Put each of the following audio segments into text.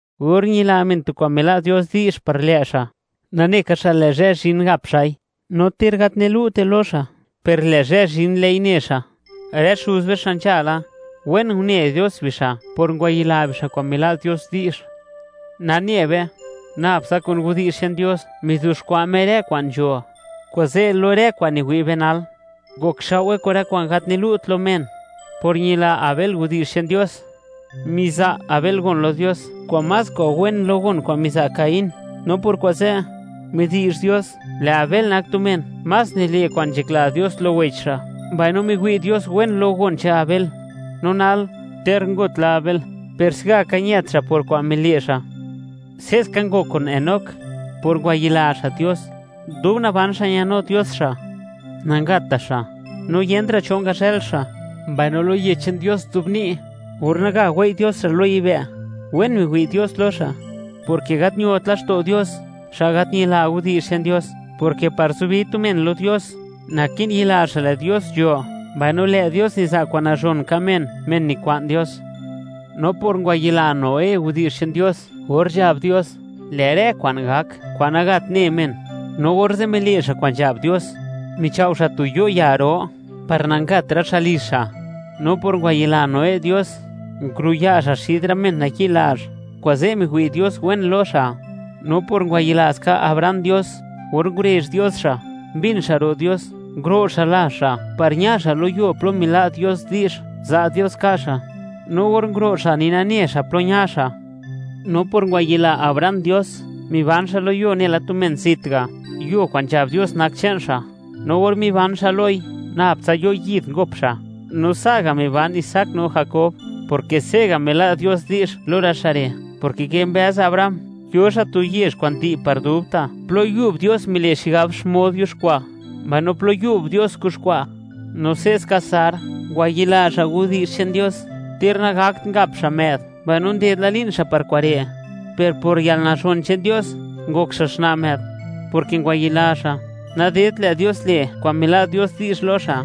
Or ñila men tu kwa'n mila' Dios di'zh par lë' xa', nane ka xa' lë' zhë zhin gap xa'i; no ter gat nilu'te lo xa', per lë' zhë zhin, lë'i ne xa'. Rë xuz be xa' nzhala, wen une Dios bixa' por ngwayila bixa' kwa'n mila' Dios di'zh. Nane be, nab tsa kun widi'zh che'n Dios mizuxkwa' Me rë kwa'n nzho; kuze' lo rë kwa'n niwi' be nal, ngokxao'we kun rë kwa'n gat nilu't lo men. Por ñila Abel widi'zh che'n Dios, miza' Abel gon lo Dios kwa'n más kwa'n wen lo gon kwa'n miza' Caín; no por kuze', midi'zh Dios, lë' Abel nak tu men más nile' kwa'n nzhakla Dios lo wech xa'. Mbaino, miwi' Dios wen lo gon che'n Abel, no nal, ter ngut la Abel, per se'gaka ñët xa' por kwa'n mile' xa'. Se'ska ngok kun Enoc, por ngwayila xa' Dios, dub naban xa' ñanu Dios xa'; nangatta' xa', no yentra' cho ngazhël xa'; mbaino lo Widi'zh che'n Dios nzobni', or naga wei' Dios xa' lo yibë', wen miwi' Dios lo xa', porke gat ñot laxto' Dios, xa' gat ñila widi'zh che'n Dios, porke par zubi tu men lo Dios, naki'n yila xa', lë' Dios nzho, mbaino lë' Dios niza' kwa'n nazhon ka' men, men nikwa'n Dios. No por ngwayila Noé widi'zh che'n Dios or nzhab Dios, lë' rë kwa'n gak, kwa'n nagat ne men, no orze' mile' xa' kwa'n nzhab Dios, michao' xa' tu yo' ya ro, par nangat rë xa' lizh xa'. No por ngwayila Noé Dios, nguruya' xa' xid rë men nayi'lazh; kuze' miwi' Dios wen lo xa'. No por ngwayila ska Abraham Dios, or ngurezh Dios xa', mbin xa' ro' Dios, nguro' xa' lazh xa' par ña xa' lo yuo plo mila' Dios di'zh, za' Dios ka' xa'. No or nguro' xa', ni nane xa' plo ña xa'. No por ngwayila Abraham Dios, miban xa' lo yuo nela tu men zit ga', yuo kwa'n nzhab Dios nak che'n xa', no or miban xa' loi, nab tsa yo' yid ngop xa', no sa'ga' miban Isaac no Jakob, porke se'ga' mila' Dios di'zh lo rë xa' re', porke kimbëz Abraham, yo xa' tu yezh kwa'n di' par dubta', plo yub Dios mile' xigab xmod yuxkwa', mbaino plo yub Dios kuxkwa'. No se'ska Sar, ngwayila xa' widi'zh che'n Dios; ter nangakt ngap xa' më'd mbaino nded la li'n xa' par kure', per por yalnazhon che'n Dios, ngok xa' xna' më'd, porke ngwayila xa', nadedt lë' Dios le' kwa'n mila' Dios di'zh lo xa'.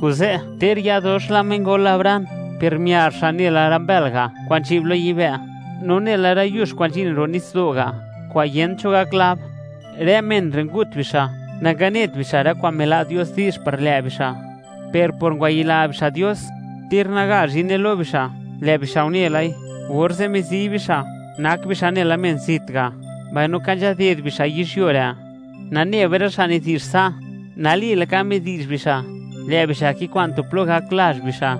Kuze', ter ya dox la mengol Abraham, per miar xa' nela rë mbël ga' kwa'n nzhi'b lo yibë', no nela rë yux kwa'n nzhin ro' nitsdo' ga', kwa'n yent cho gak lab. Rë men re' ngut bixa', nanganet bixa' rë kwa'n mila' Dios di'zh par lë' bixa'; per por ngwayila bixa' Dios, ter naga zhine lo bixa', lë' bixa' une lai, orze' mizi bixa', nak bixa' nela men zit ga', mbaino ka nzhaded bixa' yizhyuo re'. Nane be, rë xa' nidi'zh sa', nali laka midi'zh bixa', lë' bixa' kikwa'n tu plo gak lazh bixa'.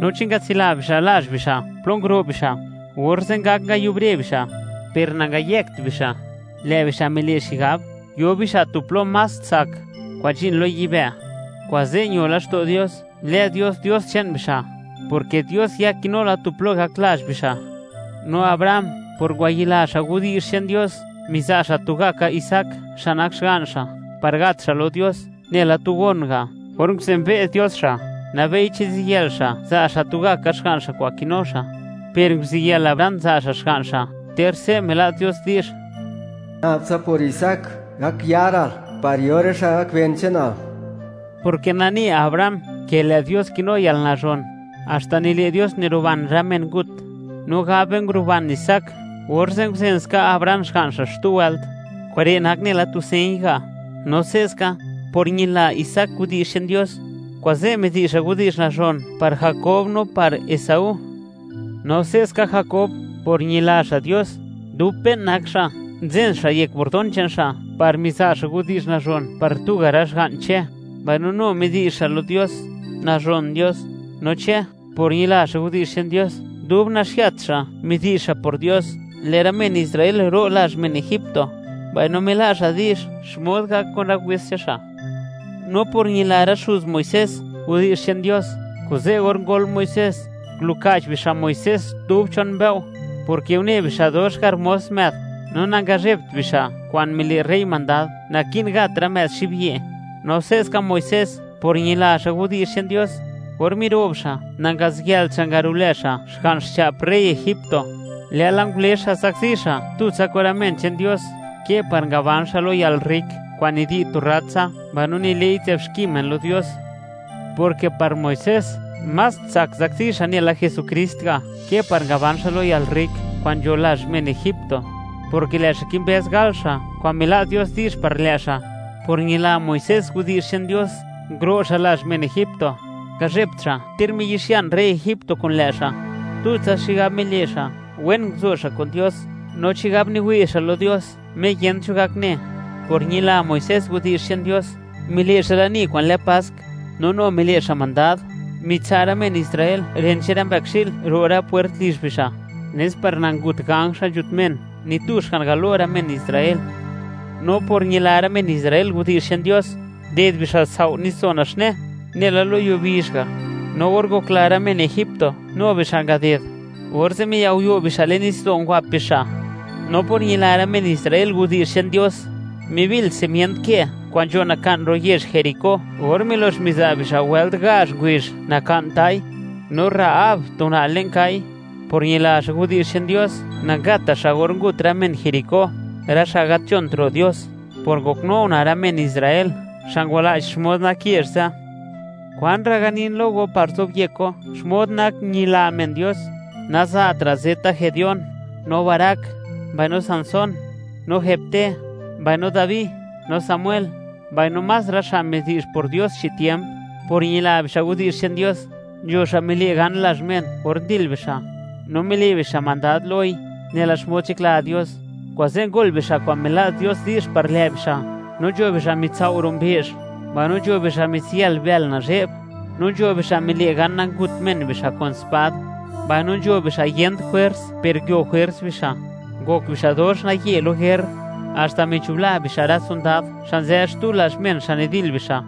No chi ngatsila bixa' lazh bixa' plo nguro' bixa', orze' ngak ngayubre bixa'. Per nangayëkt bixa'; lë' bixa' mile' xigab, yo bixa' tu plo más tsak, kwa'n nzhin lo yibë'. Kuze' ño laxto' Dios, lë Dios, Dios che'n bixa', porke Dios ya kinu la tu plo gak lazh bixa'. No Abraham, por ngwayila xa' widi'zh che'n Dios, miza' xa' tugaka Isaac, xa' nak xga'n xa', par ngat xa' lo Dios, nela tu gon ga', or nguzenbe' Dios xa' (or miwi' Dios xmod nak xa'), nabei, chi ziyël xa', za' xa' tugaka xga'n xa' kwa'n kinu xa', per nguziyël Abraham za' xa' xga'n xa', ter se' mila' Dios di'zh: “Nabtsa por Isaac, gak yaral, par yo rë xa' gak ben che'nal.” Porke nane Abraham, ke lë' Dios kinu yalnazhon, haxta nile' Dios niruban rë men ngut; no gab be, nguruban Isaac, orze' nguzenska Abraham xga'n xa' xtu wëlt. Kure' nak nela tu señ ga'. No se'ska, por ñila Isaac widi'zh che'n Dios, kuze' midi'zh xa' widi'zh nazhon par Jakob no par Esaú. No se'ska, Jakob, por ñila xa' Dios, dub pe'n nak xa', nzen xa' yek bordón che'n xa' par miza' xa' widi'zh nazhon par tuga' rë xga'n Che, mbaino nu midi'zh xa' lo Dios, nazhon Dios. No Che, por ñila xa' widi'zh che'n Dios, dub naxiat xa', midi'zh xa' por Dios, lë' rë men Israel ro' lazh men Egipto; mbaino mila' xa' di'zh xmod gak kun rë wes che'n xa'. No por ñila rë xuz Muisés, widi'zh che'n Dios, kuze' or ngol Muisés, nguluka'ch bixa' Muisés dub chon mbëo', porke une bixa', dox harmós më'd, no nangazhebt bixa' kwa'n mile' rey mandad, naki'n gat rë më'd xibyi'. No se'ska Muisés, por ñila xa' widi'zh che'n Dios, or miro'b xa', nangaziyëlt xa' ngarulë xa' xga'n xcha'p rey Egipto, lë'la ngule xa' zakzi xa' tutsa kun rë men che'n Dios, ke par ngaban xa' lo yalrrik kwa'n nidi' tu rratsa mbaino nile'i nzë'b xki men lo Dios, porke par Muisés, más tsak zakzi xa' nela Jesukrist ga', ke par ngaban xa' lo rë yalrrik kwa'n nzho lazh men Egipto; porke lë' xa' kimbëz gal xa' kwa'n mila' Dios di'zh par lë' xa'. Por ñila Muisés widi'zh che'n Dios, nguro' xa' lazh men Egipto, ngazhebt xa' ter miyi'xian rey Egipto kun lë' xa'; tutsa xigab mile' xa', wen nguzo xa' kun Dios, no chigab niwi' xa' lo Dios Me yent cho gak ne. Por ñila Muisés widi'zh che'n Dios, mile' xa' lani kwa'n lë Pask, no nu mile' xa' mandad, mitsa' rë men Israel ren che'n rë mbëkxi'l ro' rë pwert lizh bixa', nes par nangut ganj xa' nzhut men, ni tu xga'n galo rë men Israel. No por ñila rë men Israel widi'zh che'n Dios, nded bixa' sao' nitsdo' Naxne, nela lo yuo bizh ga'; no or ngokla rë men Egipto, nu bixa' ngaded, orze' miao'yo' bixa' le'n nitsdo', ngwap bixa'. No por ñila rë men Israel widi'zh che'n Dios, mibil simient ke kwa'n nzho naka'n ro' yezh Jericó, or milox miza' bixa' wëlt gazh ngubizh, naka'n ta'i. No Rahab, tu una' le'n kai (kwa' gal), por ñila xa' widi'zh che'n Dios, nangatta' xa' or ngut rë men Jericó, rë xa' gat nzhont ro' Dios, por ngoknu una' rë men Israel xa' ngwala'ch xmod nak yezh ze'. ¿Kwanra' ganin lo go par zobyek go, xmod nak ñila men Dios? Naza'tra' ze'ta Gedeón, no Barac, mbaino Sansón, no Jefté, mbaino Dabi no Samuel, mbaino más rë xa' midi'zh por Dios chi tiemp. Por ñila bixa' widi'zh che'n Dios, nzho xa' mile' gan lazh men or ndil bixa', no mile' bixa' mandad loi nela xmod nzhakla Dios, kuze' ngol bixa' kwa'n mila' Dios di'zh par lë' bixa'; no nzho bixa' mitsao' ro' mbe'zh; mbaino nzho bixa' mitsiyal bël nazhe'b, no nzho bixa' mile' gan nangut men bixa' kun spad. Mbaino nzho bixa' yent jwers, per nguio jwers bixa', ngok bixa' dox naye lo yër, haxta michubla bixa' rë sondad xa' nzë xtu lazh men xa' nidil bixa'.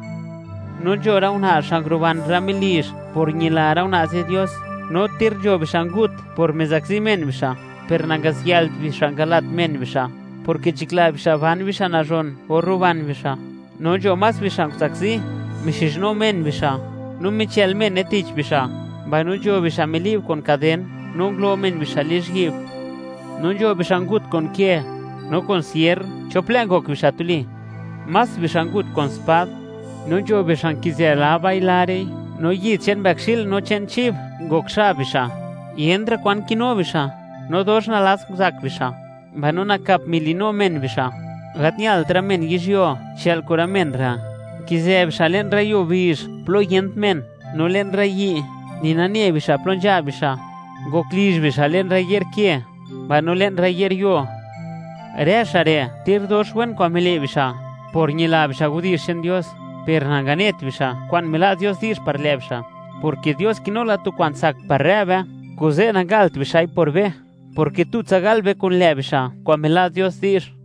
No nzho rë una' xa' nguruban rë melizh por ñila rë una' ze' Dios; no ter nzho bixa' ngut por mizakzi men bixa', per nangaziyëlt bixa' ngala't men bixa', porke nzhakla bixa' ban bixa' nazhon or ruban bixa'. No nzho más bixa' nguzakzi, mixizhnu men bixa', no michël mene tich bixa'; mbaino nzho bixa' mili'b kun kaden, no ngulo men bixa' lizhyi'b. No nzho bixa' ngut kun ke, no kun sierr, chop lë' ngok bixa' tuli. Más bixa' ngut kun spad, no nzho bixa' nkizë laba'i, lare'i; no ngok xab bixa' yid che'n mbëkxi'l no che'n chib, yentra' kwan kinu bixa'; no dox nalats nguzak bixa', mbaino nakap mili'nu men bixa'. Gat ñalt rë men yizhyuo chë'l kun rë men re'; nkizë bixa' le'n rë yuo bizh plo yent men, no le'n rë yi', ni nane bixa' plo nzha bixa', ngok lizh bixa' le'n rë ye'r ke mbaino le'n rë ye'r yuo. Rë xa' re', ter dox wen kwa'n mile' bixa' por ñila bixa' widi'zh che'n Dios, per nanganet bixa' kwa'n mila' Dios di'zh par lë' bixa', porke Dios kinu la tu kwa'n tsak par rë be, kuze' nangalt bixa'i por be, porke tutsa gal be kun lë' bixa' kwa'n mila' Dios di'zh.